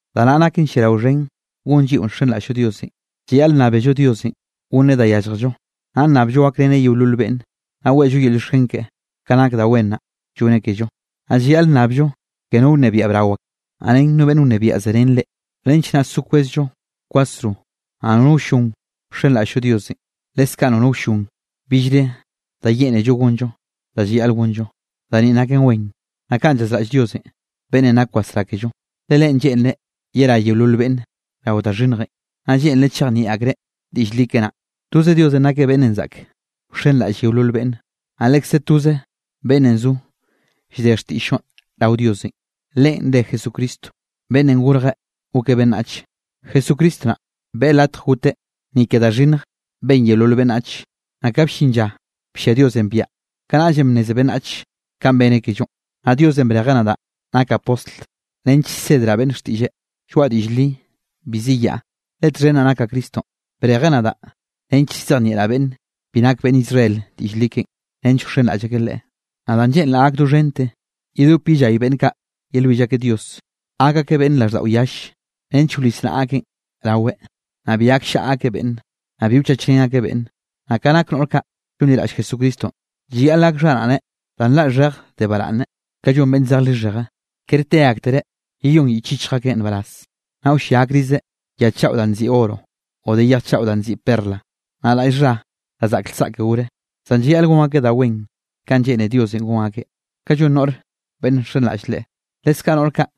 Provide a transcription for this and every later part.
Da naꞌ nake lliarao xhen gon lliꞌo nxenraꞌll Diosenꞌ: llayaꞌl nnábello Diosenꞌ gonneꞌ da yálljello, naꞌ nnabllo gakreneꞌ yeolol beꞌnne, naꞌ weꞌllo yel llioxken keꞌe, ka nak da wen naꞌ lloneꞌ kello. Naꞌ llayaꞌl nnabllo ke no wnebiaꞌ brao ak, naꞌ ren no beꞌnn wnebiaꞌ zerén reꞌ, nench naꞌ so kwezllo kwasro, naꞌ nono wllon wxenraꞌll-llo Diosenꞌ, leskaꞌ nono wllon billre da lleꞌnello gonllo da llayaꞌl gonllo. Da ni naken wen, naꞌ kaꞌn llazraꞌll Diosenꞌ, beꞌnnenꞌ nak wasrá kello. Le Leꞌen lleꞌnreꞌ yerá yeolol beꞌnne rao da xhinnjenꞌ, naꞌ lleꞌnreꞌ chejnieꞌ akreꞌ diꞌll li keꞌe naꞌ. Toze Diosenꞌ nakeꞌ beꞌnnenꞌ zaꞌk wxenraꞌll yeolol beꞌnne, naꞌ lekze toze beꞌnnenꞌ zo llde xtiꞌll-llonꞌ rao Diosenꞌ, Leꞌen re Jesucristonꞌ beꞌnnenꞌ gorje gokeꞌ beꞌnnach. Jesucristo naꞌ beꞌe latje goteꞌ ni ke da xhinnj ben yeolol beꞌnnach, naꞌ ka bllin lla bllia Diosenꞌ biaꞌa, kanaꞌllenꞌ bnneze beꞌnnach kanꞌ beneꞌ kellonꞌ. Naꞌ Diosenꞌ brejeꞌ nadaꞌ nakaꞌ postl, nench llsedraꞌ beꞌnne xtiꞌlleꞌ. Lloaꞌa diꞌll li, bi ziyaꞌ, le txhen naꞌ nakaꞌ Cristonꞌ, brejeꞌ nadaꞌ nench llzejnieꞌraꞌ beꞌnn bi nake beꞌnn Israel diꞌll li keꞌen, nench wxenraꞌll akeꞌ Leꞌe. Naꞌ danꞌ lleꞌnraꞌ gak doxhente, yedop yellay beꞌnn kaꞌ yelwill akeꞌ Dios, gak akeꞌ beꞌnn raꞌlldaꞌo yalle, nench wlis naꞌa akeꞌn raweꞌ, naꞌ bi gakllaꞌa akeꞌ beꞌnne, naꞌ bi wchachrén akeꞌ beꞌnne. Naꞌ ka nak noꞌr kaꞌ llonliraꞌll Jesucristonꞌ, llayaꞌl gak xharaꞌne da nlaꞌ xhej de baraꞌnne, ka llon beꞌnn zej lixheje, kere te aktereꞌ yeyón yich yichj akeꞌn nbaraz, naꞌ wllia akrizeꞌ ya chaꞌo danꞌ nziꞌi oro o de yej chaꞌo danꞌ nziꞌi perla, naꞌ raꞌll xha da zaꞌk lsaꞌke gore. Zan llayaꞌl gon akeꞌ da wen kanꞌ lleꞌne Diosenꞌ gon akeꞌ, kanꞌ llon noꞌr beꞌnn nxenraꞌll Leꞌe. Leskaꞌ noꞌr kaꞌ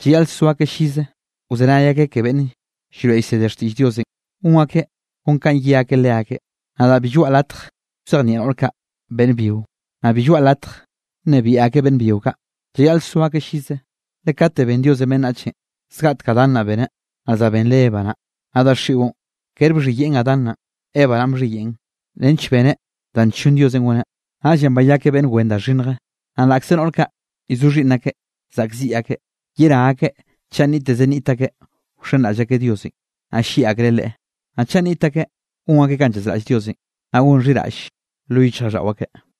llayaꞌl so akeꞌ llize wzenay akeꞌ ke beꞌnn llroeꞌ llsede xtiꞌll Diosenꞌ, gon akeꞌ kon kanꞌ ye akeꞌ leakeꞌ. Nadaꞌ bi lloaꞌa latj wzejnieꞌ noꞌr kaꞌ beꞌnn byio, naꞌ bi lloaꞌa latj nnebiaꞌ akeꞌ beꞌnn byio kaꞌ. Llayaꞌl so akeꞌ llize. Le kate ben Diosenꞌ beꞌnnach, zgaꞌtek Adán naꞌ beneꞌ, naꞌ za benreꞌ Eva naꞌ. Naꞌ daxiꞌon kere bxhiyeꞌn Adán naꞌn, Eva naꞌn bxhiyeꞌn nench beneꞌ daꞌn nllon Diosenꞌ goneꞌ, naꞌllenꞌ bayakeꞌ beꞌnn wen da xhinnje. Naꞌ laꞌkze noꞌr kaꞌ llzo xhiꞌnn akeꞌ zaꞌkziꞌ akeꞌ, yerá akeꞌ chaꞌ nniꞌtteze nniꞌt akeꞌ wxenraꞌll akeꞌ Diosenꞌ, naꞌ llieꞌ akreꞌ Leꞌe, naꞌ chaꞌ nniꞌt akeꞌ gon akeꞌ kanꞌ llazraꞌll Diosenꞌ, naꞌ gon xhiraꞌll lo yichjraꞌlldaꞌo akeꞌ.